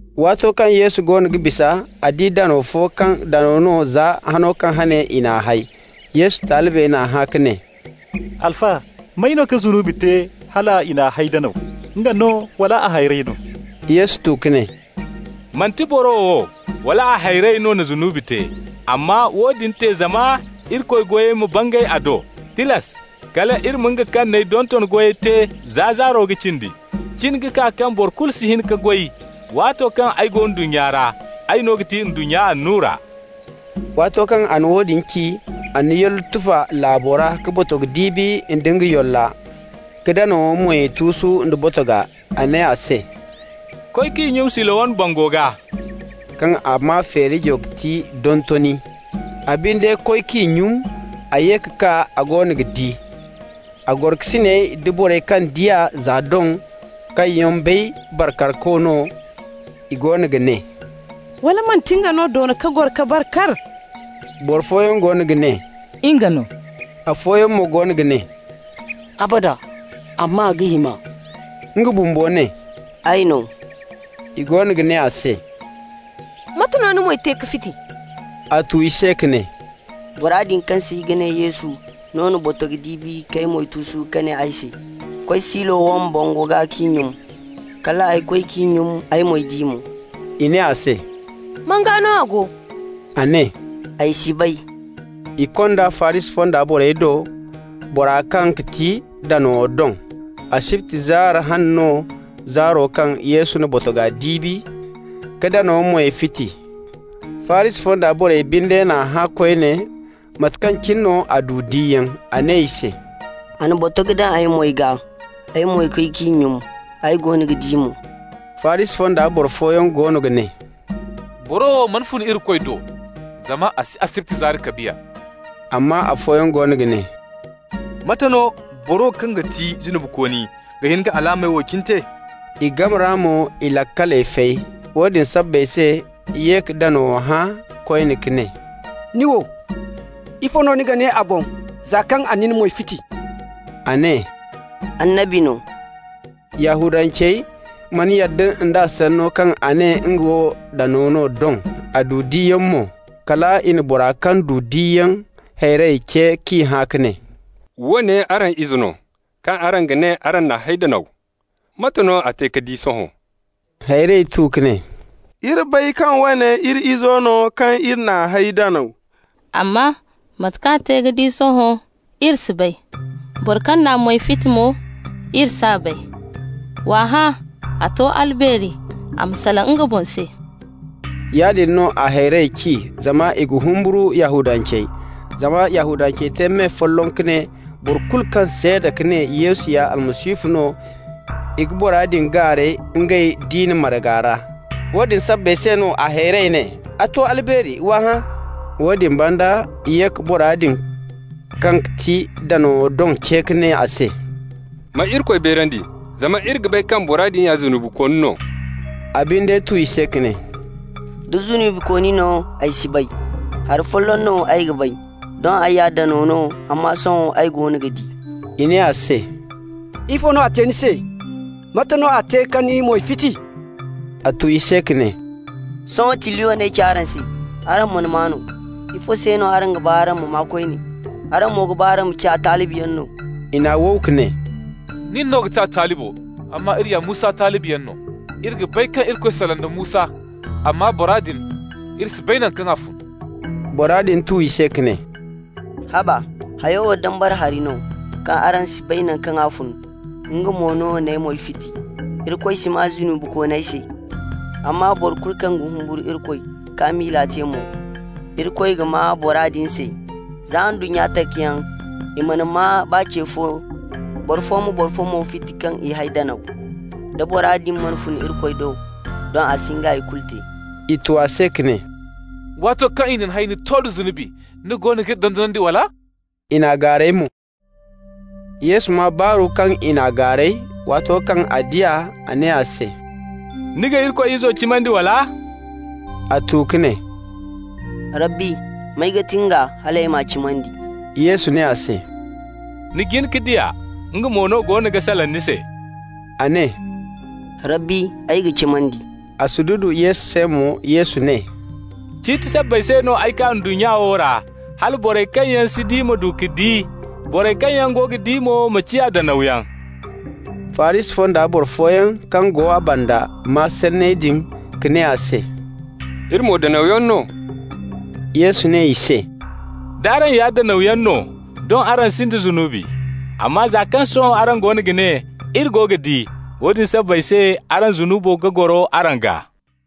Waato kaŋ Yesu goono ga bisa, a di danaw fo kaŋ danaw no za hano kaŋ hane i n'a hay. Yesu talibey n'a hã ka ne: «Alfa, may no ka zunubi te hal i n'a hay danaw? Nga no, wala a hayrey no?» Yesu tu ka ne: «Manti boro wo wala a hayrey no na zunubi te. Amma woodin te zama Irikoy goyey ma bangay a do. Tilas kal iri ma nga kaŋ n'ay donton goyey te za zaaro ga cindi. Cin ga kaa kaŋ boro kulu si hin ka goy. Waato kaŋ ay go ndunnya ra, ay no ga ti ndunnya annura.» Waato kaŋ a na woodin ci, a na yollo tufa laabo ra ka botogo diibi nda yolla ka danawo moy tuusu nda botoga. A ne a se: «Koy k'i nyum Silowam bango gaa» (kaŋ a maa feerijo ga ti Dontoni). A binde koy k'i nyum. A ye ka kaa, a goono ga di! A gorokasiney da borey kaŋ di a za doŋ, kaŋ yaŋ bay bar karko no, i goono ga ne: «Wala manti nga no doona ka goro ka bar kar?» Boro fooyaŋ goono ga ne: «Nga no.» Afooyaŋ mo goono ga ne: «Abada! Amma a ga him'a.» Nga bumbo ne: «Ay no.» I goono ga ne a se: «Mate no ni moy te ka fiti?» A tu i se ka ne: «Bora din kaŋ se i ga ne Yesu no na botogo diibi k'ay moy tuusu ka ne ay se: ‹Koy Silowam bango gaa k'i nyum.› Kal ay koy k'i nyum, ay moy di mo.» I ne a se: «Man gaa no a go?» A ne: «Ay si bay.» I kond'a Farisi fonda borey do, bora kaŋ ga ti danaw doŋ. Asibti zaari hane no, zaaro kaŋ Yesu na botoga diibi ka danawo moy fiti. Farisi fonda borey binde n'a hã koyne mate kaŋ cine no a du diyaŋ. A ne i se: «A na botogo daŋ ay moy gaa. Ay mo koy k'i nyum, ay goono ga di mo.» Farisi fonda boro fooyaŋ goono ga ne: «Boro wo mana fun Irikoy do, zama a si asibti zaari kabiya.» Amma afooyaŋ goono ga ne: «Mate no boro kaŋ ga ti zunubikooni ga hin ka alaamey wo cine te?» I game ra mo, i laakaley fay. Woodin sabbay se i ye ka danawo hã koyne ka ne: «Nin wo, ifo no ni ga ne a boŋ za kaŋ a na ni moy fiti?» A ne: «Annabi no.» Yahudancey mana yadda nd'a sanno kaŋ a ne nga wo danaw no doŋ, a du diyaŋ mo. Kal i na bora kaŋ du diyaŋ hayrey ce k'i hã ka ne: «Woone araŋ ize no, kaŋ araŋ ga ne araŋ n'a hay danaw? Mate no a te ka di sohõ?» A hayrey tu ka ne: «Iri bay kaŋ woone iri izo no kaŋ iri n'a hay danaw. Amma mate kaŋ a te ka di sohõ, iri si bay. Bora kaŋ n'a moy fiti mo, iri s'a bay. W'a hã, a to albeeri, a ma salaŋ nga boŋ se.» Yaadin no a hayrey ci, zama i ga humburu Yahudancey. Zama Yahudancey te me folloŋ ka ne boro kulu kaŋ seeda ka ne Yesu ya Almasihu no, i ga bora din gaaray ngey diina marga ra. Woodin sabbay se no a hayrey ne: «A to albeeri, w'a hã.» Woodin banda i ye ka bora din kaŋ ga ti danaw doŋ ce ka ne a se: «Ma Irikoy beerandi, zama iri ga bay kaŋ bora din ya zunubikooni no.» A binde tu i se ka ne: «Da zunubikooni no, ay si bay. Hari folloŋ no ay ga bay: doŋ ay ya danaw no, amma sohõ ay goono ga di.» I ne a se: «Ifo no a te ni se? Mate no a te ka ni moy fiti?» A tu i se ka ne: «Sohõ tilliyo no ay ci araŋ se. Araŋ mana maa mo. Ifo se no araŋ ga ba araŋ ma maa koyne? Araŋ mo ga ba araŋ ma ciya a talibiyaŋ no?» I n'a wow ka ne: «Nin no ga ti a talibo, amma iri ya Musa talibiyaŋ no. Iri ga bay kaŋ Irikoy salaŋ da Musa, amma bora din, iri si bay naŋ kaŋ a fun.» Bora din tu i se ka ne: «Haba? Hayo wo dambara hari no, kaŋ araŋ si bay naŋ kaŋ a fun, nga mo no n'ay moy fiti. Iri ga bay kaŋ Irikoy si maa zunubikooney se, amma boro kulu kaŋ ga humburu Irikoy k'a miila te mo, Irikoy ga maa bora din se. Za ndunnya takayaŋ i mana maa baa ce fo boro fo ma boro fo mo fiti kaŋ i hay danaw. Da bora din mana fun Irikoy do, doŋ a si hin ka hay kulu te.» I tu a se ka ne: «Waato kaŋ i na ni hay ni to da zunubi. Nin no goono g'iri dondonandi, wala?» I n'a gaaray mo. Yesu maa baaru kaŋ i n'a gaaray. Waato kaŋ a di a, a ne a se: «Ni ga Irikoy Izo cimandi, wala?» A tu ka ne: «Rabbi, may ga ti nga hal ay m'a cimandi?» Yesu ne a se: «Ni jin ka di a. Nga mo no goono ga salaŋ ni se.» A ne: «Rabbi, ay ga cimandi!» A sududu Yesu se mo. Yesu ne: «Ciiti sabbay se no ay kaa ndunnya wo ra hala borey kaŋ yaŋ si di ma du ka di, borey kaŋ yaŋ go ga di mo ma ciya danawyaŋ.» Farisi fonda boro fooyaŋ kaŋ go a banda maa sanney din ka ne a se: «Iri mo danawyaŋ no?» Yesu ne i se: «D'araŋ ya danawyaŋ no, doŋ araŋ sinda zunubi. Amma za kaŋ sohõ araŋ goono ga ne: ‹Iri go ga di› -- woodin sabbay se araŋ zunubo ga goro araŋ gaa.»